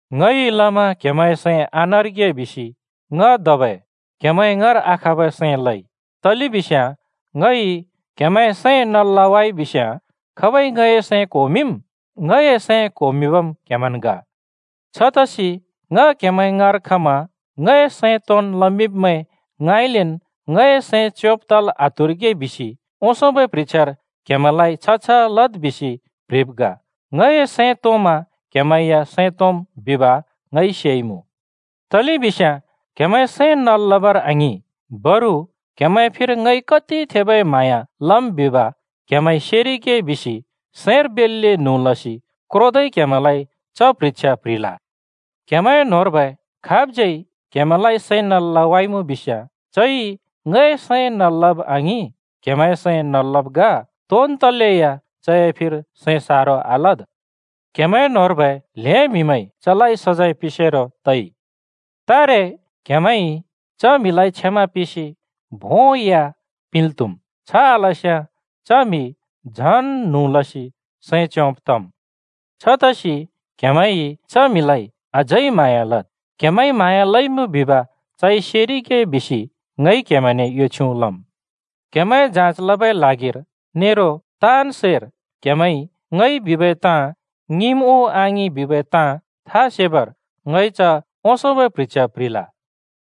ङइ लमा क्‍हेमैंए सैं आनरिगे बिसि ङ धबै क्‍हेमैं ङाँर आखबै सैं लइ, तलेबिस्याँ ङइ क्हेमैंए सैं नल् लवाइ बिस्याँ खाबइ ङए सैं क्‍होमिंम्? ङए सैं क्होमिंबम् क्हेमैंन् ग। छतसि ङ क्‍हेमैं ङाँर खमा ङए सैं तोंन् लमिंब्मैं ङाँइलेन् ङए सैं च्योंब् तल् आत्हुरिगे बिसि ओंसोंबै प्ह्रिछ्यार क्‍हेमैंलाइ छ छ लद् बिसि प्‍ह्रिब् ग। ङए सैं तोंमा क्‍हेमैं या सैं तोंम् बिब ङइ सेइमुँ। तलेबिस्याँ क्हेमैंए सैं नल् लबर आङिं, बरु क्हेमैंए फिर ङइ कति थेबै म्हाँया लम् बिब क्हेमैंइ सेरिगे बिसि सैंर बेल्‍ले न्हुँ लसि क्रोदै क्‍हेमैंलाइ च प्ह्रिछ्या प्‍ह्रिल। क्‍हेमैं न्‍होंर्बै खाबज्यै क्हेमैंलाइ सैं नल् लवाइमुँ बिस्याँ, चइ ङए सैं नल् लब आङिं, क्हेमैंए सैं नल् लब् ग। तोन् तलेया चए फिर सैं सारो आलद्। क्‍हेमैं न्‍होंर्बै ल्हें म्‍हिमैंइ चलाइ सजैं पिंसेरो तइ। तारे क्‍हेमैंइ च म्हिलाइ क्षमा पिंसि भों या पिंल् त्‍हुम्। छ आलस्‍याँ च म्‍हि झन् न्हुँ लसि सैं च्योंब तम्। छतसि क्‍हेमैंइ च म्हिलाइ अझै म्हाँया लद्। क्हमैंइ म्हाँया लइमुँ बिब चइ सेरिगे बिसि ङइ क्‍हेमैंने यो छ्युँ लम्। क्‍हेमैंए जाँच लबै ल्हागिर नेरो ताँन् सैर क्‍हेमैंइ ङइ बिबै ताँ ङिंम् उ आङिं बिबै ताँ था सेबर ङइ च ओंसोंबै प्ह्रिछ्या प्‍ह्रिल।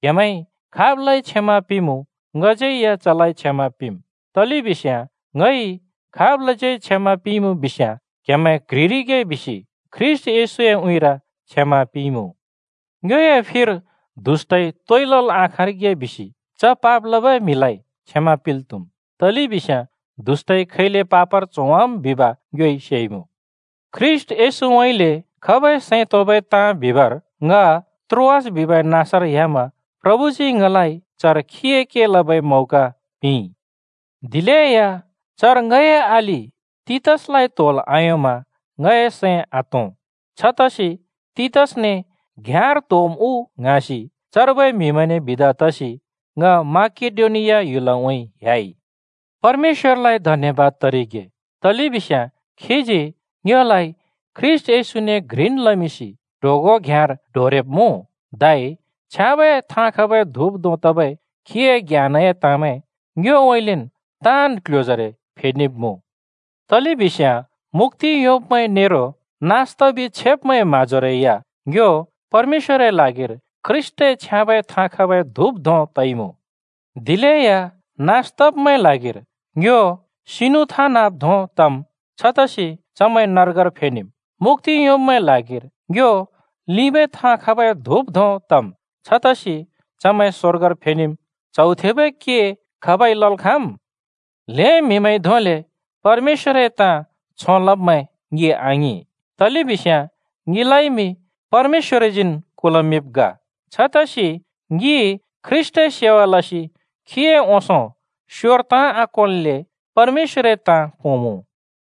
क्‍हेमैंइ खाबलाइ क्षमा पिंमुँ ङज्‍यैया चलाइ क्षमा पिंम्। तलेबिस्याँ ङइ खाबलाज्यै क्षमा पिंइमुँ बिस्‍याँ क्‍हेमैं क्ह्रिरिगे बिसि ख्रीष्‍ट येशूए उँइँर क्षमा पिंइमुँ। ङ्योए फिर दुष्‍टइ तोइ लल् आखाँरिगे बिसि च पाप लबै म्हिलाइ क्षमा पिंल् त्‍हुम्, तलेबिस्याँ दुष्‍टइ खैले पापर च्होवाम् बिब ङ्योइ सेइमुँ। ख्रीष्‍ट येशूउँइँले खबै सैं तोंबै ताँ बिबर ङ त्रोआस बिबै नाँसर ह्‍यामा प्रभुजी ङलाइ चर खीए के लबै मौका पिंइ। दिलेया चर ङए अलि तीतसलाइ त्‍होल् आयोंमा ङए सैं आतों। छतसि तीतसने घ्‍याँर त्‍होम् उ ङ्हाँसि चर्बै म्‍हिमैंने बिदा तसि ङ माकेडोनिया ह्‍युलउँइँ ह्‍याइ। परमेश्‍वरलाइ धन्‍यबाद तरिगे! तलेबिस्याँ खीजी ङ्योलाइ ख्रीष्‍ट येशूने घ्रिन् लमिंसि ट्होगों घ्याँर डोरेब्मुँ! धै छ्याँबै थाँ खबै धुप धों तबै खीए ज्ञानए ताँमैं ङ्योउँइँलेन् ताँन् क्‍ल्‍ह्‍योजरे फेनेब्मुँ। तलेबिस्याँ मुक्‍ति योंब्मैं नेरो नास तबि छेब्मैंए म्‍हाँजोरै या ङ्यो परमेश्‍वरए ल्हागिर ख्रीष्‍टए छ्याँबै थाँ खबै धुप धों तइमुँ। दिलेया नास तब्‍मैंए ल्हागिर ङ्यो सिनु थाँ नाँब् धों तम्। छतसि चमैं नर्गर फेनेम्। मुक्‍ति योंब्‍मैंए ल्हागिर ङ्यो लिंबै थाँ खबै धुप धोंन् तम्। छतसि चमैं स्वर्गर फेनेम्। च्हौ थेबै के खाबइ लल् खाँम्? ल्हें म्हिइ धोंले परमेश्‍वरए ताँ छों लब्मैं ङि आङिं, तलेबिस्याँ ङिलाइमि परमेश्‍वरजीन् कुल्‍मिंब् ग। छतसि ङि ख्रीष्‍टए सेवा लसि खीए ओंसों स्योर ताँ आकोंल्‍ले परमेश्‍वरए ताँ पोंमुँ।